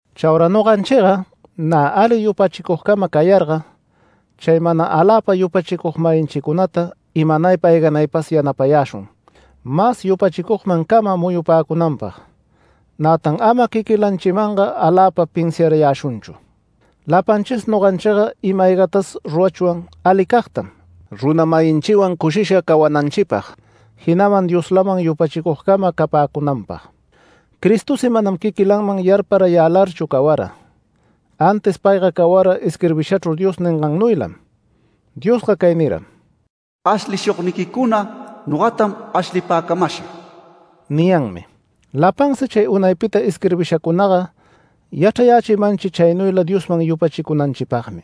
Chaura noganchiga nä ali yupachicugcama cayarga chay mana aläpa yupachicug-mayinchicunata imanaypa ayganaypas yanapayäshun mas yupachicugmancama muyupäcunanpag. Nätan ama quiquilanchimanga aläpa pinsiarayäshunchu. Lapanchisi noganchiga ima-aygatas rurachwan alicagtam runa-mayinchiwan cushisha cawananchipag, jinaman Dioslaman yupachicugcama capäcunanpag. Cristosi manam quiquilanman yaparayälarchu cawara. Antis payga cawara isquirbishachru Dios ningannuylam. Diosga cay niram: “Ashlishugniquicuna nogatam ashlipäcamasha” niyanmi. Lapansi chay unaypita isquirbishacunaga yachrayächimanchi chaynuyla Diosman yupachicuyänanchipagmi.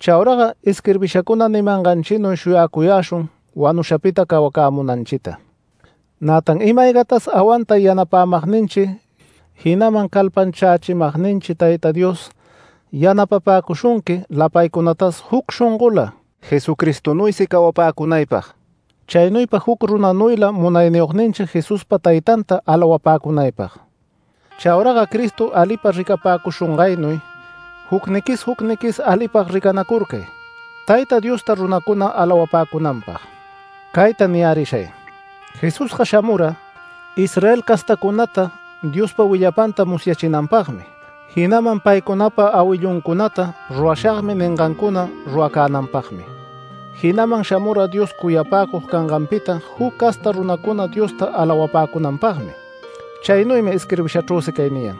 Chauraga isquirbishacuna nimanganchinuy shuyacuyäshun wanushapita cawacämunanchita. Nätan ima-aygatas awantay yanapämagninchi, jinaman calpanchächimagninchi Tayta Dios yanapapäcushunqui lapaycunatas juc shongola Jesucristonuysi cawapäcunaypag, chaynuypa juc runanuyla Munayniyogninchi Jesuspa Taytanta alawapäcunaypag. Chauraga Cristo alipa ricapäcushungaynuy jucniquis jucniquis, alipag ricanacurcay Tayta Diosta runacuna alawapäcunanpag. Cayta niyärishay: Jesusga shamura, Israel castacunata Diospa willapanta musyachinanpagmi jinaman paycunapa awilluncunata “Rurashagmi” ningancuna ruracänanpagmi. Jinaman shamura Dios cuyapäcug canganpita juc casta runacuna Diosta alawapäcunanpagmi. Chaynuymi isquirbishachrüsi cay niyan: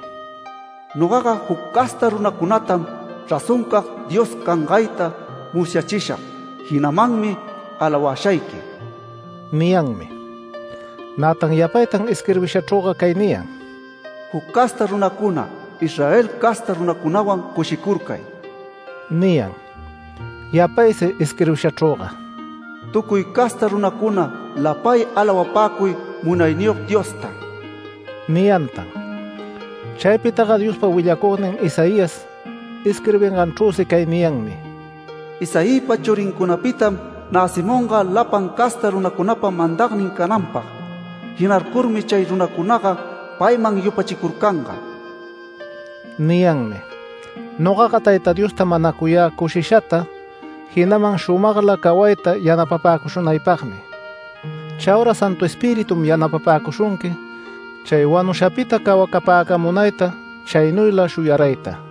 “Nogaga juc casta runacunatam razoncag Dios cangayta musyachishag jinamanmi alawashayqui” niyanmi. Nätan yapaytan isquirbishachrüga cay niyan: “Juc casta runacuna, Israel casta runacunawan cushicurcay” niyan. Yapaysi isquirbishachrüga “Tucuy casta runacuna lapay alawapäcuy Munayniyog Diosta” niyantan. Chaypitaga Diospa willacugnin Isaías isquirbinganchrüsi cay niyanmi: “Isaïpa churincunapitam näcimunga lapan casta runacunapa mandagnin cananpag. Jinarcurmi chay runacunaga payman yupachicurcanga” niyanmi. Nogaga Tayta Diosta manacuyä cushishata, jinaman shumagla cawayta yanapapäcushunaypagmi. Chaura Santu Espiritum yanapapäcushunqui chay wanushapita cawacapäcamunayta chaynuyla shuyarayta.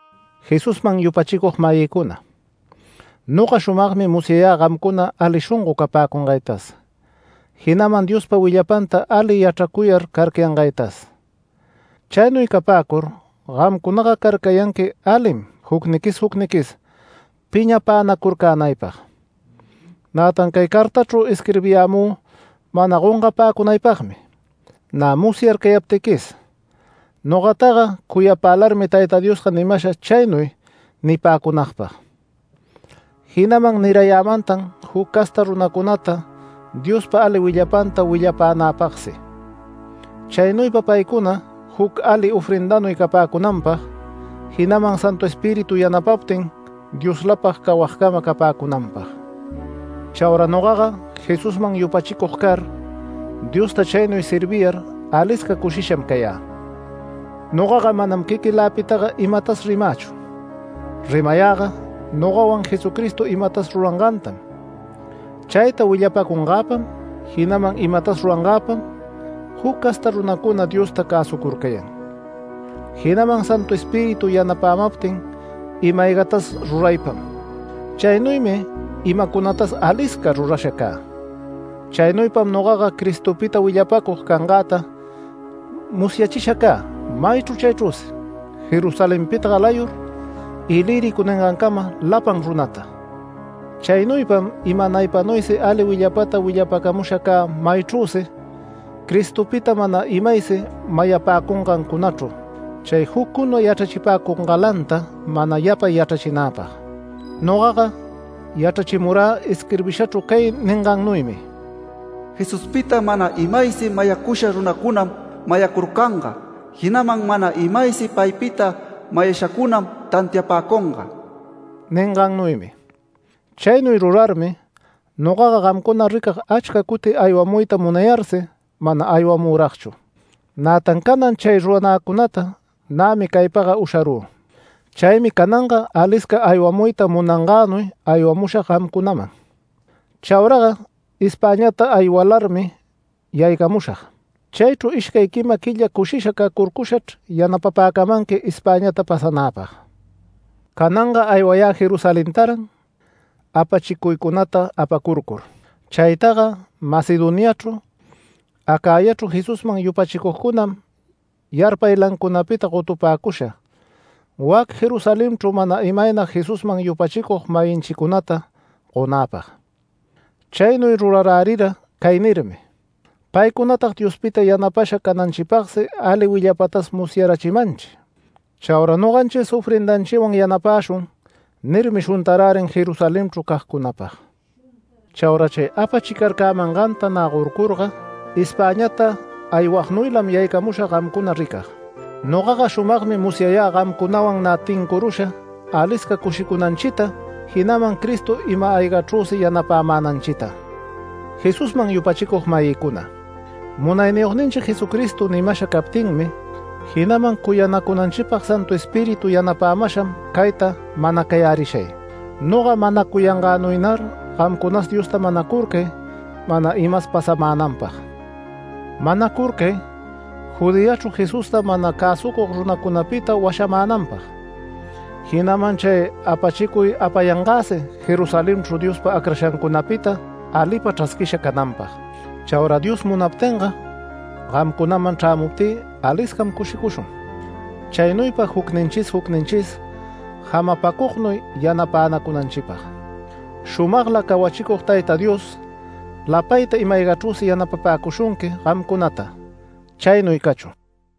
Jesusman yupachicug-mayïcuna, noga shumagmi musyayä gamcuna ali shongo capäcungaytas, jinaman Diospa willapanta ali yachracuyar carcayangaytas. Chaynuy capäcur gamcunaga carcayanqui alim jucniquis jucniquis piñapänacurcänaypag. Nätan cay cartachru isquirbiyämü mana gongapäcunaypagmi, nä musyarcayaptiquis, nogataga cuyapälarmi Tayta Diosga nimasha chaynuy nipäcunagpag. Jinaman nirayämantan juc casta runacunata Diospa ali willapanta willanäpagsi, chaynuypa paycuna juc ali ofrendanuy capäcunanpag, jinaman Santu Espíritu yanapaptin Dioslapag cawagcama capäcunanpag. Chaura nogaga Jesusman yupachicug car, Diosta chaynuy serviyar alisca cushisham cayä. Nogaga manam quiquiläpitaga imatas rimächu. Rimayäga nogawan Jesucristo imatas rurangantam. Chayta willapacungäpam, jinaman imatas rurangäpam juc casta runacuna Diosta cäsucurcayan. Jinaman Santu Espíritu yanapämaptin ima-aygatas ruraypam. Chaynuymi imacunatas alisca rurasha cä. Chaynuypam nogaga Cristopita willapacug cangäta musyachisha cä, maychru chaychrüsi, Jerusalenpita galayur, Ilírico ningancama lapan runata. Chaynuypam imanaypanuysi ali willapata willapäcamusha cä maychrüsi Cristopita mana imaysi mayapäcungancunachru, chay juccuna yachrachipäcungalanta mana yapay yachrachinäpag. Nogaga yachrachimurä isquirbishachru cay ningannuymi: “Jesuspita mana imaysi mayacusha runacunam mayacurcanga, jinaman mana imaysi paypita mayashacunam tantiapäcunga” ningannuymi. Chaynuy rurarmi nogaga gamcuna ricag achca cuti aywamuyta munayarsi mana aywamüragchu. Nätan canan chay ruranäcunata nämi caypaga usharü. Chaymi cananga alisca aywamuyta munangänuy aywamushag gamcunaman. Chauraga Espäñata aywalarmi yaycamushag, chaychru ishcay quima quilla cushisha cacurcushachr yanapapäcamanqui Espäñata pasanäpag. Cananga aywayä Jerusalentaran apachicuycunata apacurcur. Chaytaga Macedoniachru, Acayachru Jesusman yupachicugcunam yarpaylancunapita gotupäcusha, wac Jerusalenchru mana imaynag Jesusman yupachicug-mayinchicunata gonäpag. Chaynuy rurarärira cay nirmi: “Paycunatag Diospita yanapasha cananchipagsi ali willapatas musyarayächimanchi. Chaura noganchis ofrendanchiwan yanapäshun” nirmi shuntarärin Jerusalenchru cagcunapag. Chaura chay apachicarcamanganta nä gorcurga, Espäñata aywagnuylam yaycamushag gamcuna ricag. Nogaga shumagmi musyayä gamcunawan nä tincurusha alisca cushicunanchita, jinaman Cristo ima-aygachrüsi yanapämänanchita. Jesusman yupachicug-mayïcuna, Munayniyogninchi Jesucristo nimasha captinmi, jinaman cuyanacunanchipag Santu Espíritu yanapämasham cayta manacayärishay: Noga manacuyangänuynar gamcunas Diosta manacurcay mana imas pasamänanpag. Manacurcay Judeachru Jesusta mana cäsucug runacunapita washamänanpag, jinaman chay apachicuy apayangäsi Jerusalenchru Diospa acrashancunapita alipa chrasquisha cananpag. Chaura Dios munaptinga gamcunaman chrämuptï aliscam cushicushun, chaynuypa jucninchis jucninchis jamapacugnuy yanapänacunanchipag. Shumagla cawachicug Tayta Dios lapayta ima-aygachrüsi yanapapäcushunqui gamcunata. Chaynuy cachun.